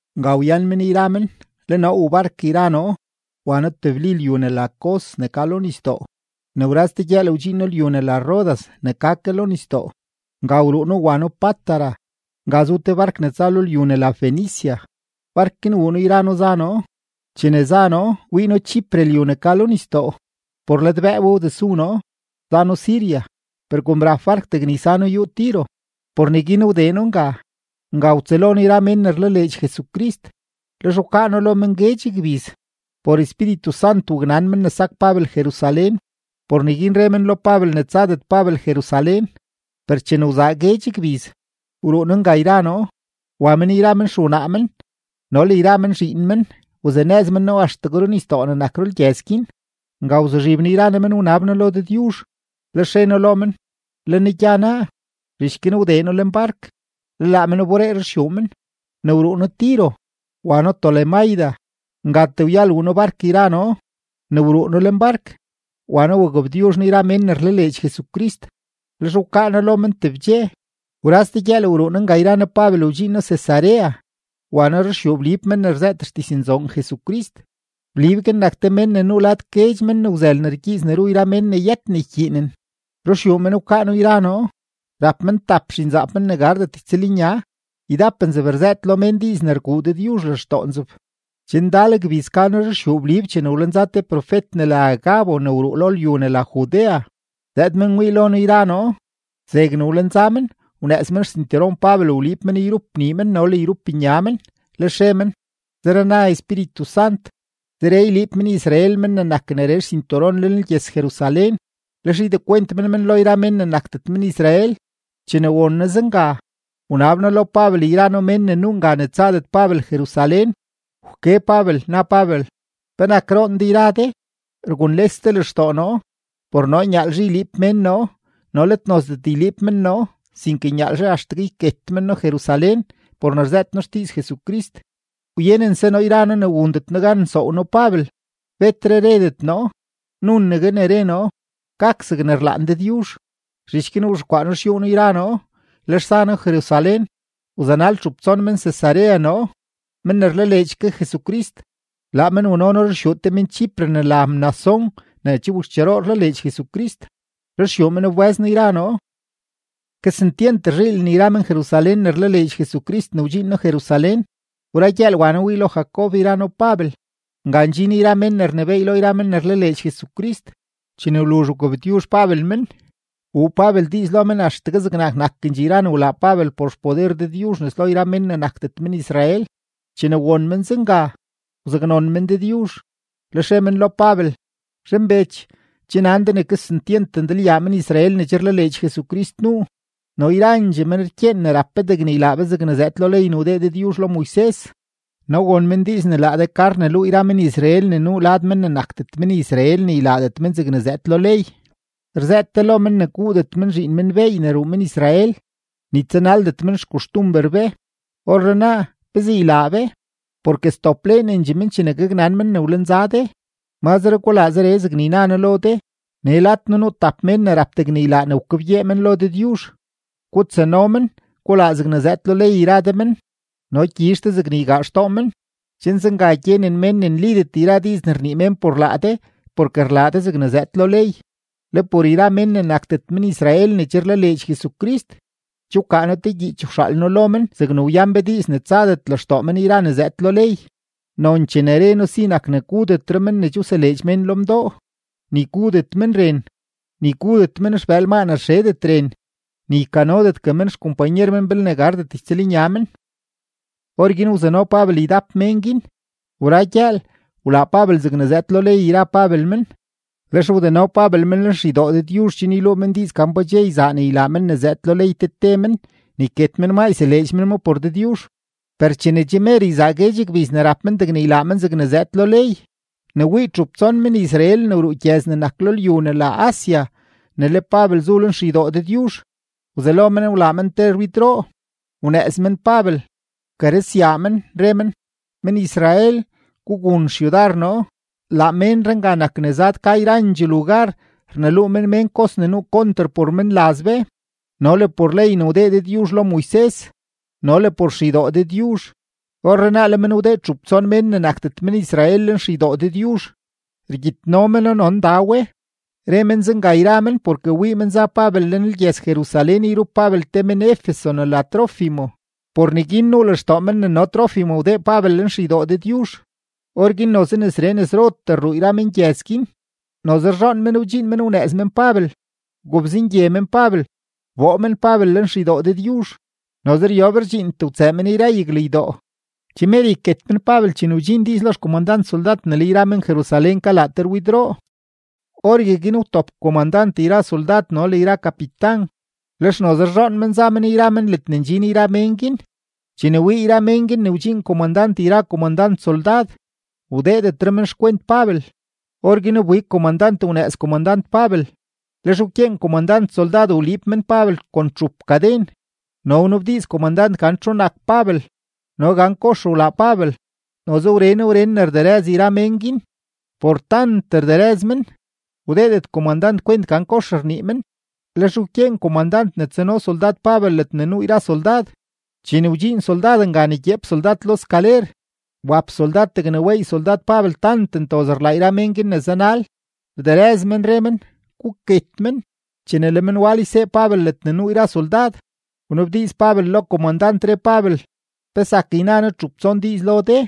Nga wyan men yra men, le noo wuu bark yra noo wa noo tebli lyu ne la Cos ne ka lo nisdoo. Ne wra ste gyëël wdxiin noo lyu ne la Rodas ne ka ke lo nisdoo; nga wruu noo wa noo Pátara. Nga zu te bark ne tsa lo lyu ne la Fenicia, bark guin wuu noo yra noo za noo. Chene za noo, wii noo Chipre lyu ne ka lo nisdoo; por ladbëë we wdesu noo, za noo Siria. Per kom rap bark degne ysano yúú Tiro, por neguin wdee noo nga. Nga wtsëlo noo yra mén ne rlaleedx Jesucrist, lex wkaa noo lo men guedx gbiz. Por Espíritu Sant waknan men ne sak Pabel Jerusalén; por neguin re men lo Pabel ne tsadet Pabel Jerusalén. Per chene wzaa guedx gbiz, wruu noo nga yra noo. Wa men yra men xewnaa men no le yra men zhiin men wazanëz men noo axtegue runisdoo ne nak rulgyëz guin. Nga wzuzhib noo yra noo men wnab noo lo Dëdyuzh. Lex re noo lo men: “Le noo gya naa.” Zhich guin wdee noo lenbark, le laa men wberee ruxyuu men. Ne wruu noo Tiro, wa noo Tolemaida; ngatee wyal wuu noo lenbark yra noo. Ne wruu noo lenbark, wa noo wagabtyuzh noo yra mén ne rlaleedx Jesucrist, lex wkaa noo lo men tebdxe. Wra ste gyëël wruu noo nga yra noo Pabel wdxiin noo Cesarea, wa noo ruxyuu Blib men ne rzëët xdiznzoon Jesucrist. Blib guin nak te men ne nuu lad guedx men ne wzël ne rgyiiz ne ru yra mén ne yët ne ykyiinen. Ruxyuu men wkaa noo yra noo. Rap men tap zhinzaap men ne gardet ytsëlnya, ydap nzeb rzëët lo mén diiz ne rguu Dëdyuzh lextoo nzeb. Che ndal gbiz ka noo ruxyuu Blib chene wlenza te profet ne la Agabo ne wruu lo lyu ne la Judea; zëëd men wii lo noo yra noo. Zegne wlenza men, wnëëz men xsinturon Pabel wliib men yrup nii men no le yrup nya men, lex re men: ―Zere na Espíritu Sant, zeree yliib men-Israel men ne nak neree xsinturon lenlgyëz-Jerusalén, lex ydekwent men men lo yra mén ne nakdet men-Israel. Chene won noo zenga, wnab noo lo Pabel yra noo mén ne nuu nga ne tsadet Pabel Jerusalén. Wke Pabel, na Pabel: ―¿Penak roon de yra de, rgunles de lextoo noo? Por noo nyaalzhe yliib mén noo no let nozdet yliib men noo, sinke nyaalzhe axtegue yket men noo Jerusalén por ne rzëët noo xdiiz Jesucrist. Wyenense noo yra noo ne wundet noo gan nsoow noo Pabel, betre redet noo, nunegue ne re noo: ―Gak zegne rlaan Dëdyuzh. Zhich guin wzhexkwaa noo xyúú noo yra noo, lex za noo Jerusalén. Wzanal txup tson men-Cesarea noo, men ne rlaleedx ke Jesucrist. Laa men wano noo ruxyuu te men-Chipre ne la Mnasón ne che wakxcheroo rlaleedx Jesucrist; ruxyuu men wbë́z noo yra noo. Kesentyent rzhiilen yra men-Jerusalén ne rlaleedx Jesucrist ne wdxiin noo Jerusalén. Wra gyëël, wa noo wii lo Jacob yra noo Pabel; nga ndxin yra mén ne rnebééy lo yra men ne rlaleedx Jesucrist. Chene wluzh wgabtyuzh Pabel men, wuu Pabel diiz lo men axtegue zegnak nakendxee yra ne wlaa Pabel por xpoder Dëdyuzh nes lo yra mén ne nakdet men-Israel. Chene won men zenga, wzaknon men Dëdyuzh, lex re men lo Pabel: ―Zhanbech, che nan de ne kesentyent ndalyaa men-Israel ne che rlaleedx Jesucrist nuu, no yrandxee men rkyeen ne rap be degne ylaa be zegne zëëd lo ley ne wdee Dëdyuzh lo Moises. No won men diiz ne laa de ka rneluu yra men-Israel ne nuu lad mén ne nakdet men-Israel ne ylaadet men zegne zëëd lo ley, rzëët de lo men ne guudet men zhiin men beey ne ruu men-Israel, ni tsanaldet men xkoxtumber be. Orrenaa, ¿pezee ylaa be? Porke sdopleenendxee men chene gaknan men ne wlenza de. Mazre gulaa zeree zegne yna noo lo de: Nee lad noo nuu tap mén ne rap degne ylaa ne wkebgyee men lo Dëdyuzh. Gutsano men, gulaa zegne zëëd lo ley yra de men, no gyizh de zegne ygaa xtoo men, chen zenga gyenen mén ne nlidet yra diiz ne rnii mén por laa de porke rlaa de zegne zëëd lo ley. Le por yra mén ne nakdet men-Israel ne che rlaleedx Jesucrist, che wkaa noo te gyiich wxaal noo lo men zegne wyan be diiz ne tsadet lextoo men yra ne zëëd lo ley. Nonchee ne re noo si nak ne gudetre men ne che wseleedx mén lo mdoo, ni gudet men ren, ni gudet men xbëël maa ne rxedet ren, ni ykanodetgue men xkompanyer men belne gardet ytsëlnya men. Orguin wzano Pabel ydap mén guin; wra gyëël, wlaa Pabel zegne zëëd lo ley yra Pabel men, lex wdeno Pabel men lenxeydoo Dëdyuzh chen yluu men diiz gan pa dxe yzaa ne ylaa men ne zëëd lo ley te te men ne yket men maa yseleedx men ma por Dëdyuzh. Per chene che mer yzaa guedx gbiz ne rap men degne ylaa men zegne zëëd lo ley, ne wii txup tson men-Israel ne wruu gyëz ne nak lo lyu ne la Asia ne le Pabel zu lenxeydoo Dëdyuzh, wzelo men wlaa men te rwidroo. Wnëëz men Pabel, wkarëzyaa men, re men: ―¡Men-Israel, gugun xyudar noo! Laa ménree nga nak ne zad ka yrandxee lugar rneluu men mén kos ne nuu konter por menlaz be no le por ley ne wdee Dëdyuzh lo Moises no le por xeydoo Dëdyuzh. Orrenaa le men wdee txup tson mén ne nakdet men-Israel lenxeydoo Dëdyuzh, rgyitno meno no nda we. Re men zenga yra men porke wii men za Pabel lenlgyëz-Jerusalén yrup Pabel te men-Efeso ne la Trófimo; por neguin nuu lextoo men ne no Trófimo wdee Pabel lenxeydoo Dëdyuzh. Orguin noze nesree nesrotee rruu yra mengyëz guin, noze rzhoon men wdxiin men wnëëz men Pabel, wgobzengye men Pabel, wboo men Pabel lenxeydoo Dëdyuzh; noze ryob rdxiintee wtsëë men yra yaglaa ydoo. Che mer yket men Pabel chene wdxiin diiz lo xkomandant soldad ne le yra men-Jerusalén kalaa te rwidroo. Orgueguin wtop komandant yra soldad no le yra kapitan, lex noze rzhoon men za men yra men ledne ndxin yra mén guin. Chene wii yra mén guin ne wdxiin komandant yra komandant soldad, wdeedetre men xkwent Pabel. Orguin wbig komandant wnëëz komandant Pabel, lex wkyeen komandant soldad wliib men Pabel kon txup kaden no wnabdiiz komandant gan txu nak Pabel no gan kox wlaa Pabel. Noze wren wren ne rderëz yra mén guin; por tant rderëz men, wdeedet komandant kwent gan kox rnii men, lex wkyeen komandant ne tsano soldad Pabel ledne nuu yra soldad. Chene wdxiin soldad nga ne gyeep soldad lo skaler, wap soldad degne weey soldad Pabel tant ntoz rlaa yra mén guin ne zanal, rderëz men, re men: ―¡Guket men! Chene le men wal ysee Pabel ledne nuu yra soldad, wnabdiiz Pabel lo komandant, re Pabel: ―¿Pe zak yna noo txup tson diiz lo de?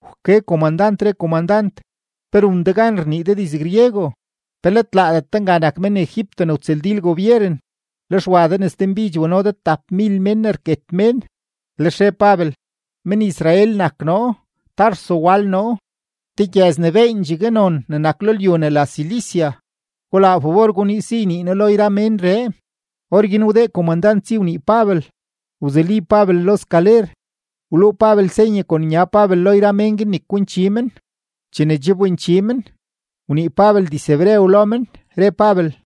Wke komandant, re komandant: ―¿Pe run de gan rnii de diz-griego? ¿Pe let laadet de nga nak men-Egipto ne wtsëldil gobyeren, lex wa de nes denbidx wano de tapmil men ne rket mén? Lex re Pabel: ―Men-Israel nak noo, Tarso wal noo, te gyëz ne beendxegue non ne nak lo lyu ne la Cilicia. Gulaa fabor guniiz si ynii noo lo yra ménree. Orguin wdee komandant si wnii Pabel. Wzuli Pabel lo skaler, wluu Pabel senye kon nya Pabel lo yra mén guin ne kwinchi men. Chene che wbinchi men, wnii Pabel diz-hebreo lo men, re Pabel: